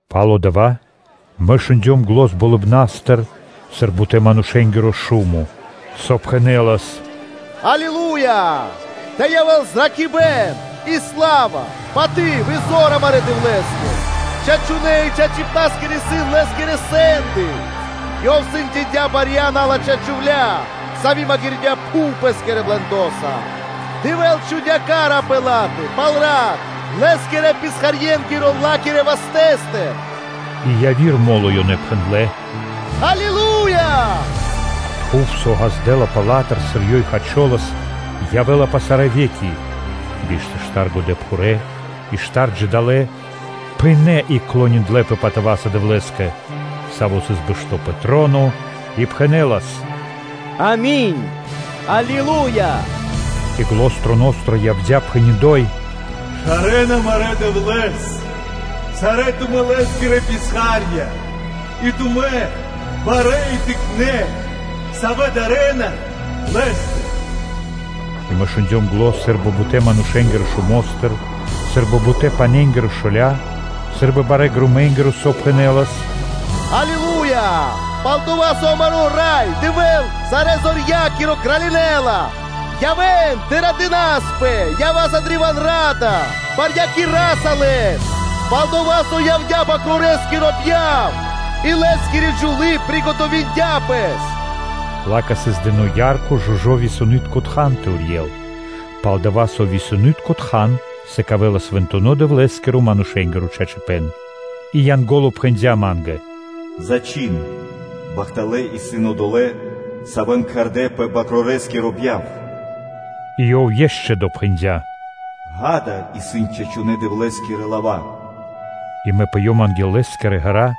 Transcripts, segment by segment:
Пало́ дава́ мэ шундём зан, сы́рбы бутэ́-манушэ́нгиро народо (ра́са) болыбна́стыр, сави́ пхэнэлас: “Аллилуя! Тэ явэ́л зракхибэ́н и сла́ва, паты́в и зор амарэ́ Дэвлэ́скэ.” Чачунэ́ и чачипнаскирэ исын Лэ́скирэ сэнды. Ёв сэндякирдя барья́ розмэкна́ джувля́, сави́ калякирдя пхув пэ́скирэ блэндо́са. Дэвэ́л чхудя́ хась (ка́ра) палэ пэ ла́тэ пал рат Лэ́скирэ писхарьенгиро ла́кирэ вастэ́стыр.” И яви́р мо́ло ёнэ пхэндлэ́: “Аллилуя! Тхув, со ґаздэ́лапэ ла́тыр, сыр ёй хачолас, явэ́ла пэ сарэ́ ве́ки.” Тэды биш тэ штар годэпхурэ́ и штар джидалэ́ (жывотна) пынэ́ и клониндлэпэ патыва́са Дэвлэ́скэ, Саво́ сыс бэшто́ пэ троно и пхэнэлас: “Ами́нь! Аллилуя!” И зан троностыр явдя́, пхэни́: “Шарэ́н амарэ́ Дэвлэ́с! Сарэ́ тумэ́-Лэ́скирэ писха́рья и тумэ́, барэ́ и тыкнэ́, савэ́ дарэ́на Лэ́стыр.” И мэ шундём зан сы́рбы бутэ́-манушэ́нгирэ народо́стыр, сы́рбы бурэ́-пане́нгирэ шоля́ (шумо), сы́рбы барэ́ громэнгиро, со пхэнэнас: “Аллилуя! Пал-дова́ со амаро́ Рай Дэвэ́л, Сарэзорья́киро кралинэла! Явэ́н тэ радынаспэ и ява́са древа́н ра́да; барьякираса Лэс слава́са, пал-дова́ со явдя́ Свэнтонэ́-Бакрорэскиро бьяв, и Лэ́скири джувлы́ приготовиндя пэс!” Ла́кэ сыс дыно́ ярко, жужо́ висонытко тхан тэ урьел: “пал-дова́ со висонытко тхан сыкавэ́ла свэнтонэ́-Дэвлэ́скирэ манушэ́нгиро чачипэ́н.” И Янго́ло пхэндя́ ма́нгэ: “Зачхин: ‘Бахталэ́ исын одолэ́, савэ́н кхардэ́ пэ Свэнтонэ́-Бакрорэ́скиро бьяв.’” И Ёв ишчо (инкэ́) допхэндя: “Ѓа́да, исын чачунэ́ Дэвлэ́скирэ лава́.” И мэ пыём анги́л лэ́скирэ ґэра́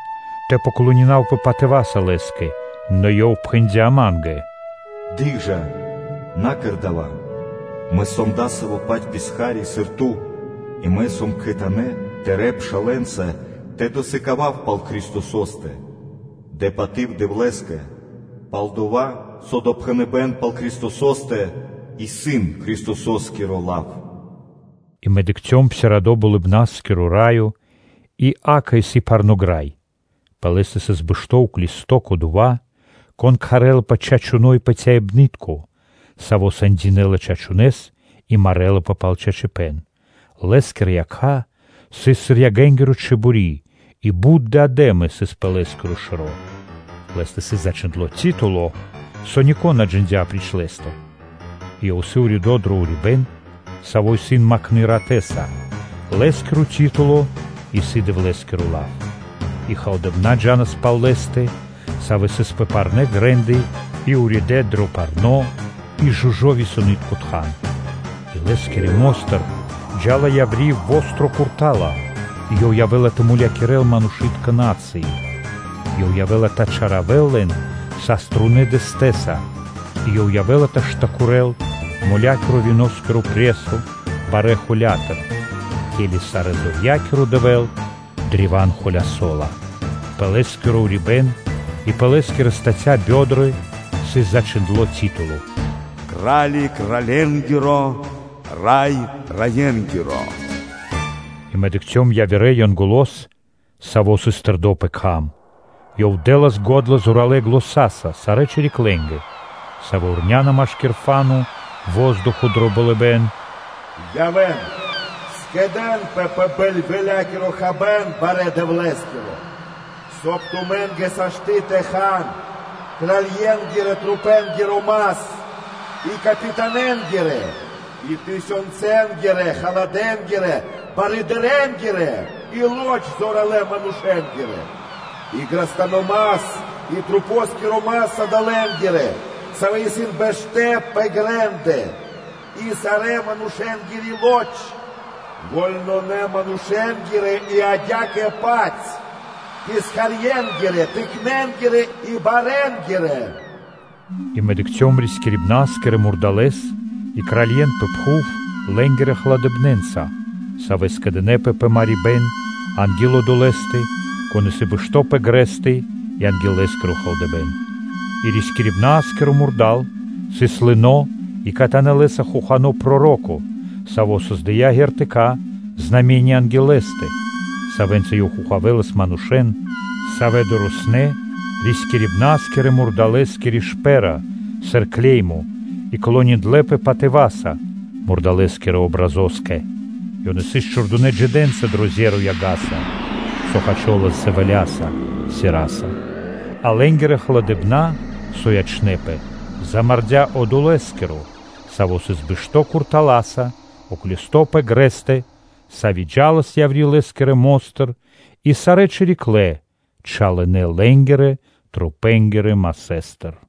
тэ поклонинавпэ патыва́са лэ́скэ. Нэ ёв пхэндя́ ма́нгэ: “Дыкх жа, на́ кэр дава́. Мэ сом дасаво-паць писха́ри, сыр ту сан, и мэ сом кхэтанэ́ тырэ́ пшалэ́нца тэ досыкавав пал Христосо́стэ. Дэ паты́в Дэвлэ́скэ, пал-дова́ со допхэныбэ́н пал Христосо́стэ исын Христосо́скиро лав.” И мэ дыкхцём псирадо (отпхандло) Болыбна́скиро Раё и, акэ, сыс парно́ грай. Пэ лэ́стэ сыс бэшто́ уклисто́/э́ Кодова́, Кон кхарэ́лапэ Чачуно́ и Патяибны́тко, Саво́ сэндякирэ́ла чачунэ́с и марэлапэ пал чачипэ́н. Лэ́скирэ якх сыс сыр яга́нгири чибори́ и бут диадэмы сыс пэ Лэ́скиро шэро́. Лэ́стэ исын зачхиндло́ титуло (лав), со нико́н на джиндя́ апри́ч Лэ́стэ, и Ёв исын уридо́ дро урибэ́н, саво́ сыс макхно ратэ́са. Лэ́скиро титуло исын “Дэвлэ́скиро Лав.” И халадэ́ болыбны́тка джа́нас пал Лэ́стэ, савэ́ сыс пэ парнэ́ грэ́ндэ и уридэ́ дро парно́ и жужо́ висонытко тхан. И Лэ́скирэ мо́стыр джа́ла яври́ востро (чолалы́) курта́ла и Ёв явэ́ла тэ мулякирэ́л расы (народы). Ёв явэ́ла тэ чалякирэл лэн саструнэ́ дэстэ́са, и Ёв явэ́ла тэ штакирэл моля́киро (виноскиро) пресо барэ́ холя́тыр, ке́ли Сарэзорья́киро Дэвэ́л древа́н холясо́ла. Пэ Лэ́скиро урибэ́н и пэ Лэ́скири статя (стёгны) сыс зачхиндло́ титуло: “Кра́ли кралье́нгиро, Рай рае́нгиро.” И мэ дыкхцём явирэ Янголо́с, саво́ сыс тэрдо́ пэ кхам. Ёв дэ́лас го́дла зоралэ́ заня́са сарэ́ чириклэнгэ, савэ́ вурняна машки́р фа́но (воздухо) дро болыбэ́н: “Явэ́н, скэдэ́нпэ пэ бэльвэлякиро хабэ́н барэ́ Дэвлэ́скиро, соб (кай) тумэ́нгэ сашты́ тэ хан кральенгирэ-трупэнгиро мас, и капитанэнгирэ, и тысёнцэнгирэ-халадэ́нгирэ барыдырэнгирэ, и лоч зоралэ́ манушэ́нгирэ, и грастано́ мас и трупо́скиро мас одолэ́нгиро, савэ́ исын бэштэ́ пэ грэ́ндэ, и сарэ́-манушэ́нгири тру́пы: вольнонэ манушэ́нгирэ и адя́кэ-паць писхарьенгирэ, тыкнэнгирэ и барэнгирэ.” И мэ дыкхцём рискирибна́скирэ мурдалэс и кралье́н пэ пхув лэ́нгирэ халадыбнэнца, савэ́ скэдынэ́пэ пэ марибэ́н анги́л Одолэ́стэ, Кон исын бэшто́ пэ грэстэ и анги́л Лэ́скиро халадыбэ́н. И рискирибна́скиро мурда́л сыс лыно́ и кхэтанэ́ лэ́са хохано́ проро́ко, саво́ кэрдя́ ди́вы анги́л лэ́стэ, савэ́нца ёв хохавэлас манушэ́н, савэ́ дорэснэ́ рискирибна́скирэ-мурдалэ́скири шпэ́ра сыр клеймо и клониндлэпэ патыва́са мурдалэ́скирэ патриня́кэ (образо́скэ). Ёнэ сыс чхурдынэ́ джидэнца дро зеро (озеро) яга́са, со хачолас дзэвэляса (сераса). А лэ́нгирэ явирэ манушэ́н, савэ́ ячнэ́пэ, замардя́ Одолэскиро, Саво́ сыс бэшто́ уклисто́/э́ пэ грэстэ куртала́са; сави́ джа́лас яври́ Лэ́скирэ мо́стыр и сарэ́ чирикля́/э́ чалынэ лэ́нгирэ трупэндыр.